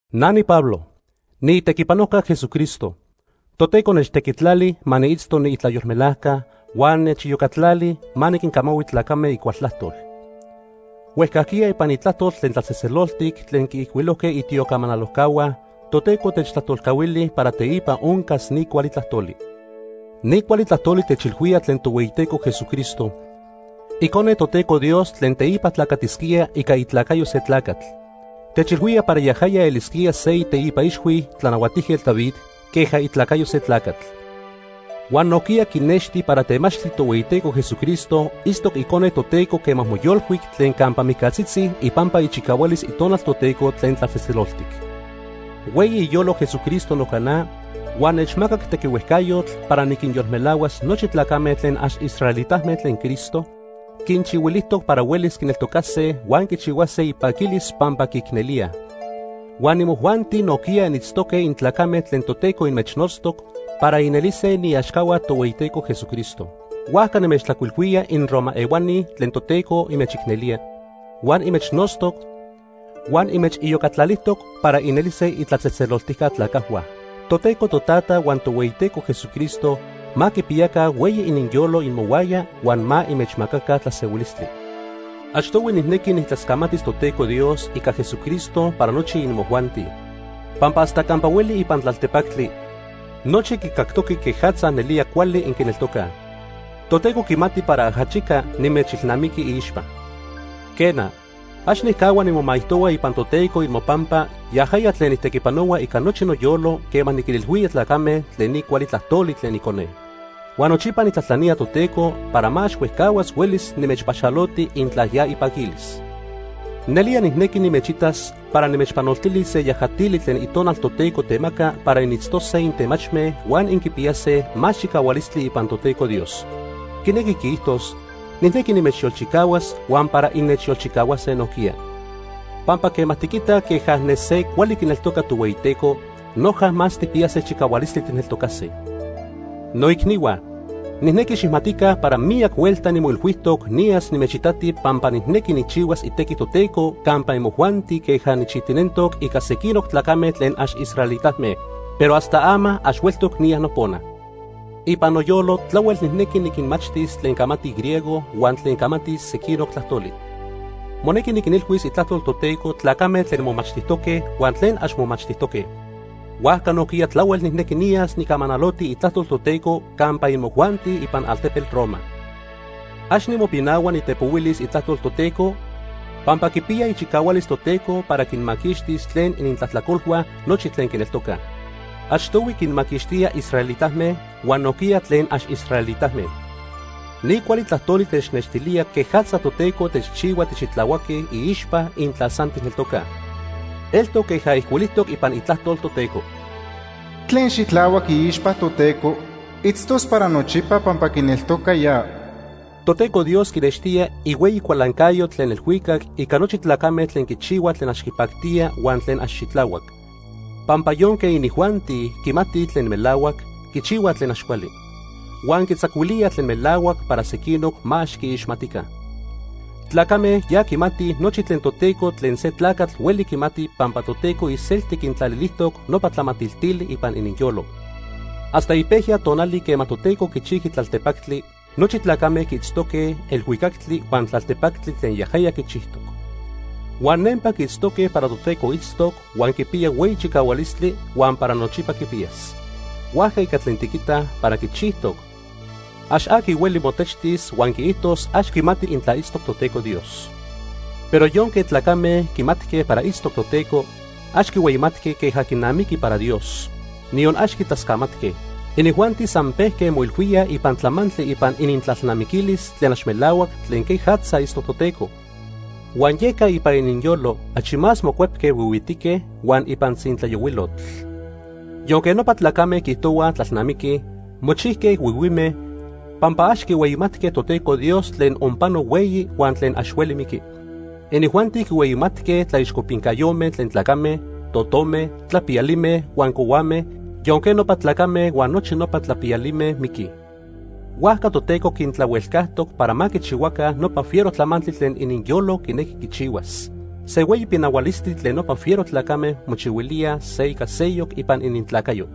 Na niPablo. Niitequipanojca Jesucristo. Toteco nechtequitlali ma niitzto niitlayolmelajca, huan nechiyocatlali ma niquincamahui tlacame icual tlajtol. Huejcajquiya ipan Itlajtol tlen tlatzejtzeloltic tlen quiijcuilojque itiocamanalojcahua, Toteco techtlajtolcahuili para teipa oncas ni cuali tlajtoli. Ni cuali tlajtoli techilhuía tlen Tohueyiteco Jesucristo, Icone Toteco Dios tlen teipa tlacatisquía ica itlacayo se tlacatl. Techilhuía para yajaya elisquía se iteipa ixhui Tlanahuatijquetl David queja itlacayo se tlacatl. Huan nojquiya quinexti para temachtli Tohueyiteco Jesucristo itztoc Icone Toteco quema moyolcuic tlen campa mijcatzitzi ipampa ichicahualis Itonal Toteco tlen tlatzejtzeloltic. Hueyi iyolo Jesucristo noca na huan nechmacac tequihuejcayotl para niquinyolmelahuas nochi tlacame tlen ax israelitame tlen Cristo quinchihuilijtoc para huelis quineltocase huan quichihuase ipaquilis pampa quiicnelíaj. Huan imojuanti nojquiya initztoque intlacame tlen Toteco inmechnotztoc para inelise iniaxcahua Tohueyiteco Jesucristo. Huajca nimechtlajcuilhuía inRoma ehuani tlen Toteco inmechicnelía, huan inmechnotztoc, huan inmechiyocatlalijtoc para inelise itlatzejtzeloltijca tlacajhua. Toteco Totata huan Tohueyiteco Jesucristo ma quipiyaca hueyi ininyolo imohuaya huan ma inmechmacaca tlasehuilistli. Achtohui nijnequi nijtlascamatis Toteco Dios ica Jesucristo para nochi imojuanti, pampa hasta campa hueli ipan tlaltepactli, nochi quicactoque quejatza nelía cuali inquineltocaj. Toteco quimati para ajachica nimechilnamiqui iixpa. Quena, ax nijcahua nimomaijtohua ipan Toteco imopampa, yajaya tlen nijtequipanohua ica nochi noyolo quema niquinilhuía tlacame tlen ni cuali tlajtoli tlen Icone. Huan nochipa nijtlajtlanía Toteco para ma ax huejcahuas huelis nimechpaxaloti intla ya ipaquilis. Nelía nijnequi nimechitas para nimechpanoltilis se yajatili tlen Itonal Toteco temaca para initztose intemachme huan inquipiyase más chicahualistli ipan Toteco Dios. Quinequi quiijtos nijnequi nimechyolchicahuas huan para innechyolchicahuase nojquiya. Pampa quema tiquitaj queja ne se cuali quineltoca Tohueyiteco, noja más tijpiyase chicahualistli tijneltocase. Noicnihua, nijnequi xijmatica para miyac huelta nimoilhuijtoc niyas nimechitati pampa nijnequi nijchihuas itequi Toteco campa imojuanti queja nijchijtinentoc ica sequinoc tlacame tlen ax israelitame, pero hasta ama ax hueltoc niya nopona. Ipan noyolo tlahuel nijnequi niquinmachtis tlen camatij griego huan tlen camatij sequinoc tlajtoli. Monequi niquinilhuis itlajtol Toteco tlacame tlen momachtijtoque huan tlen ax momachtijtoque. Huajca nojquiya tlahuel nijnequi niyas nicamanaloti itlajtol Toteco campa imojuanti ipan altepetl Roma. Ax nimopinahua nitepohuilis itlajtol Toteco, pampa quipiya ichicahualis Toteco para quinmaquixtis tlen inintlajtlacolhua nochi tlen quineltocaj. Achtohui quinmaquixtía israelitame huan nojquiya tlen ax israelitame. Ni cuali tlajtoli technextilía quejatza Toteco techchihua tixitlahuaque iixpa intla san tijneltocaj. Eltoc queja ijcuilijtoc ipan Itlajtol Toteco: “Se tlen xitlahuac iixpa Toteco, itztos para nochipa pampa quineltoca ya.” Toteco Dios quinextía ihueyi cualancayo tlen elhuicac ica nochi tlacame tlen quichihuaj tlen ax quipactía huan tlen ax xitlahuac, pampa yonque inijuanti quimatij tlen melahuac, quichihuaj tlen ax cuali, huan quitzacuilía tlen melahuac para sequinoc ma ax quiixmatica. Tlacame ya quimatij nochi tlen Toteco tlen se tlacatl hueli quimati pampa Toteco iselti quintlalilijtoc nopa tlamatiltili ipan ininyolo. Hasta ipejya tonali quema Toteco quichijqui tlaltepactli, nochi tlacame quiitztoque elhuicactli huan tlaltepactli tlen yajaya quichijtoc. Huan nempa quiitztoque para Toteco itztoc, huan quipiya hueyi chicahualistli, huan para nochipa quipiyas. Huajca ica tlen tiquitaj para quichijtoc, ax aqui hueli motechtis huan quiijtos ax quimati intla itztoc Toteco Dios. Pero yonque tlacame quimatque para itztoc Toteco, ax quihueyimatque queja quinamiqui para Dios, niyon ax quitlascamatque. Inijuanti san pejque moilhuíaj ipan tlamantli ipan inintlalnamiquilis tlen ax melahuac tlen quejatza itztoc Toteco, huan yeca ipan ininyolo achi más mocuepque huihuitique huan ipan tzintlayohuilotl. Yonque nopa tlacame quiijtohuaj tlalnamiquij, mochijque huihuime, pampa ax quihueyimatque Toteco Dios tlen onpano hueyi huan tlen ax hueli miqui. Inijuanti quinhueyimatque tlaixcopincayome tlen tlacame, totome, tlapiyalime huan cohuame, yonque nopa tlacame huan nochi nopa tlapiyalime miquij. Huajca Toteco quintlahuelcajtoc para ma quichihuaca nopa fiero tlamantli tlen ininyolo quinequi quichihuas. Se hueyi pinahualistli tlen nopa fiero tlacame mochihuilíaj se ica seyoc ipan inintlacayo.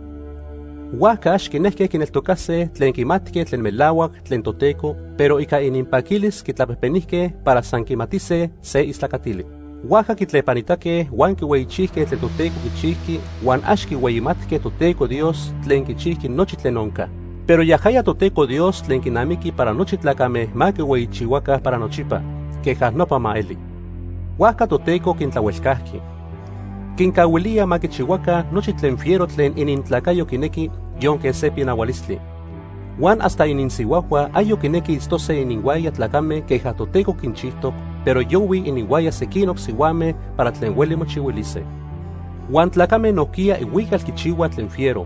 Huajca ax quinejque quineltocase tlen quimatque tlen melahuac tlen Toteco, pero ica ininpaquilis quitlapejpenijque para san quimatise se istlacatili. Huajca quitlepanitaque huan quihueyichijque tlen Toteco quichijqui huan ax quihueyimatque Toteco Dios tlen quichijqui nochi tlen onca. Pero yajaya Toteco Dios tlen quinamiqui para nochi tlacame ma quihueyichihuaca para nochipa. Queja nopa ma eli. Huajca Toteco quintlahuelcajqui. Quincahuilía ma quichihuaca nochi tlen fiero tlen inintlacayo quinequi, yonque se pinahualistli. Huan hasta ininsihuajhua ayoc quinequij itztose ininhuaya tlacame queja Toteco quinchijtoc, pero yohuij ininhuaya sequinoc sihuame para tlen hueli mochihuilise. Huan tlacame nojquiya ihuical quichihuaj tlen fiero.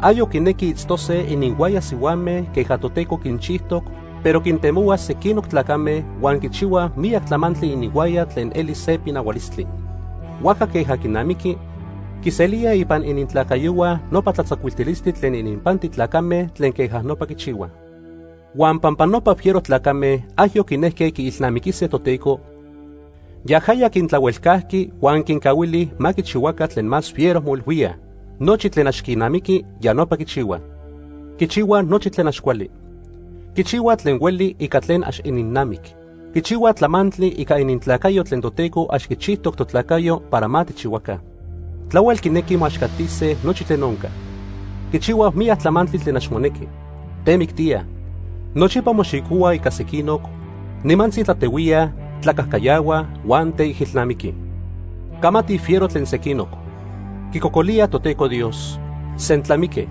Ayoc quinequij itztose ininhuaya sihuame queja Toteco quinchijtoc, pero quintemohuaj sequinoc tlacame huan quichihuaj miyac tlamantli ininhuaya tlen eli se pinahualistli. Huajca queja quinamiqui, quiselíaj ipan inintlacayohua nopa tlatzacuiltilistli tlen ininpanti tlacame tlen queja nopa quichihuaj. Huan pampa nopa fiero tlacame ayoc quinejque quiilnamiquise Toteco, yajaya quintlahuelcajqui huan quincahuili ma quichihuaca tlen más fiero moilhuíaj. Nochi tlen ax quinamiqui, ya nopa quichihuaj. Quichihuaj nochi tlen ax cuali. Quichihuaj tlen hueli ica tlen ax ininnamic. Quichihuaj tlamantli ica inintlacayo tlen Toteco ax quichijtoc totlacayo para ma tijchihuaca. Tlahuel quinequij moaxcatise nochi tlen onca. Quichihuaj miyac tlamantli tlen ax monequi. Temictíaj, nochipa moxicohuaj ica sequinoc, nimantzi tlatehuíaj, tlacajcayahuaj, huan teijilnamiquij. Camatij fiero tlen sequinoc. Quicocolíaj Toteco Dios. Sentlamique.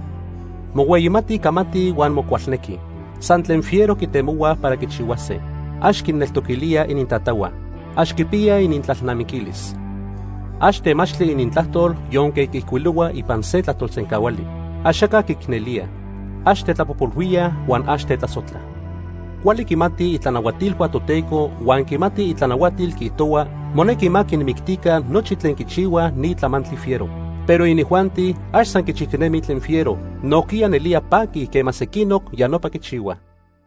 Mohueyimatij camatij huan mocualnequij. San tlen fiero quitemohuaj para quichihuase. Ax quinneltoquilíaj inintatahua. Ax quipiyaj inintlalnamiquilis. Ax temachtli inintlajtol yonque quiijcuilohuaj ipan se tlajtolsencahuali. Axaca quiicnelíaj. Ax tetlapojpolhuíaj huan ax tetlasojtlaj. Cuali quimatij itlanahuatilhua Toteco huan quimatij itlanahuatil quiijtohua monequi ma quinmictica nochi tlen quichihuaj ni tlamantli fiero. Pero inijuanti ax san quichijtinemij tlen fiero, nojquiya nelía paquij quema sequinoc ya nopa quichihuaj.